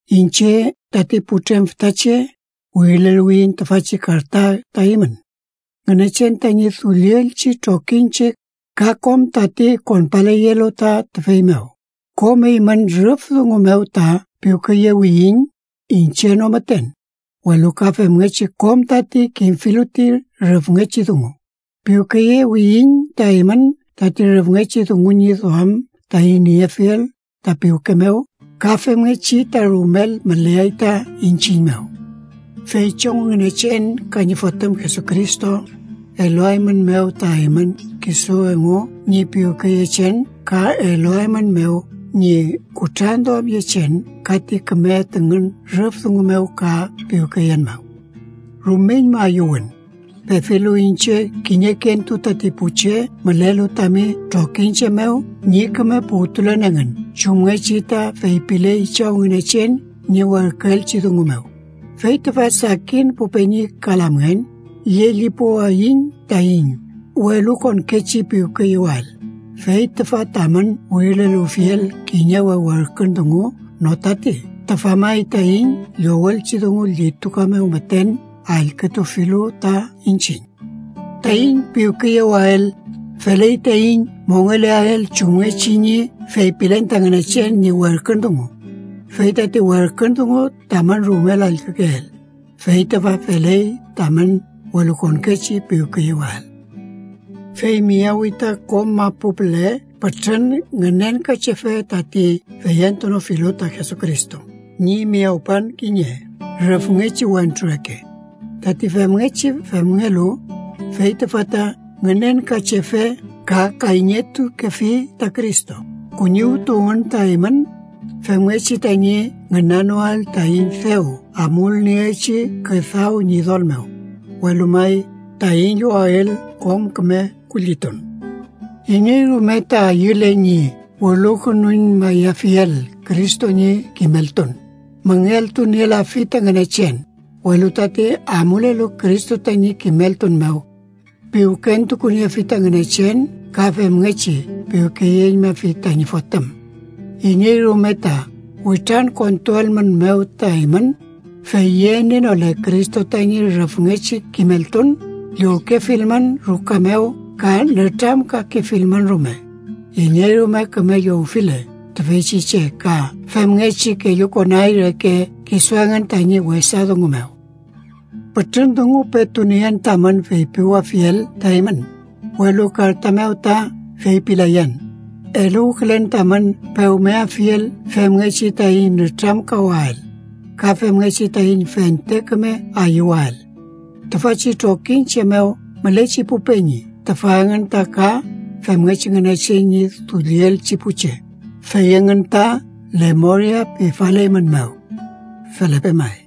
Iñche, tati putrem fütache, wirileluwiyiñ tüfachi karta ta eymün, Ngünechen tañi dullielchi trokiñche ka kom tati konpaleyelu ta tüfey mew. Kom eymün rüf dungu mew ta piwkeyewiyiñ. Iñche no müten, welu ka femngechi kom tati kimfilu ti rüfngechi dungu. Piwkeyewiyiñ ta eymün tati rüfngechi dungu ñi duam taiñ niefiel ta piwke mew ka femngechi ta rumel müleay ta iñchiñ mew. Fey Chaw Ngünechen, ka ñi Fotüm Jesucristo, eluaeymünmew ta eymün kisu engu ñi piwkeyechen ka eluaeymünmew ñi kutranduamyechen ka ti küme tüngün rüf dungu mew ka piwkeyen mew. Rumeñma ayüwün, pefilu iñche kiñekentu tati pu che mülelu tami trokiñche mew ñi küme puwtulen engün chumngechi ta feypiley Chaw Ngünechen ñi werküelchi dungu mew. Fey tüfa, sakin pu peñi ka lamngen, llellipuwayiñ taiñ welukonkechi piwkeyewael. Fey tüfa tamün wirileluwfiel kiñe we werkün dungu no tati, tüfa may taiñ llowelchi dungu llituka mew müten allkütufilu ta iñchiñ. Taiñ piwkeyewael, feley taiñ mongeleael chumngechi ñi feypilen ta Ngünechen ñi werkün dungu. Fey tati werkün dungu, tamün rumel allkükeel, fey tüfa: feley tamün welukonkechi piwkeyewael. Fey miyawi ta kom mapu püle pütrün ngünenkachefe tati feyentunofilu ta Jesucristo ñi miyawpan kiñe rüfngechi wentru reke. Tati femngechi femngelu, fey tüfa ta ngünenkachefe ka kayñetukefi ta Cristo. Kuñiwtuwmün ta eymün, femngechi tañi ngünanoael taiñ dew amulnieelchi küdaw Ñidol mew, welu may, taiñ llowael kom küme kullitun. Iney rume ta ayüle ñi welukünuñmayafiel Cristo ñi kimeltun, müngeltunielafi ta Ngünechen, welu tati amulelu Cristo tañi kimeltun mew, piwkentukuniefi ta Ngünechen ka femngechi piwkeyeñmafi tañi Fotüm. Iney rume ta witrankontuelmünmew ta eymün, fey yenienole Cristo tañi rüfngechi kimeltun, llowkefilmün ruka mew ka nütramkakefilmün rume. Iney rume küme llowfile tüfeychi che ka femngechi kellukonay reke kisu engün tañi wesa dungu mew. Pütrün dungu petu nien tamün feypiwafiel ta eymün, welu karta mew ta feypilayan. Eluwkülen tamün pewmeafiel femngechi taiñ nütramkawael, ka femngechi taiñ fente küme ayüwael. Tüfachi trokiñche mew mülechi pu peñi, tüfa engün ta ka femngechi Ngünechen ñi dullielchi pu che, fey engün ta lemoria pifaleymünmew. Felepe may.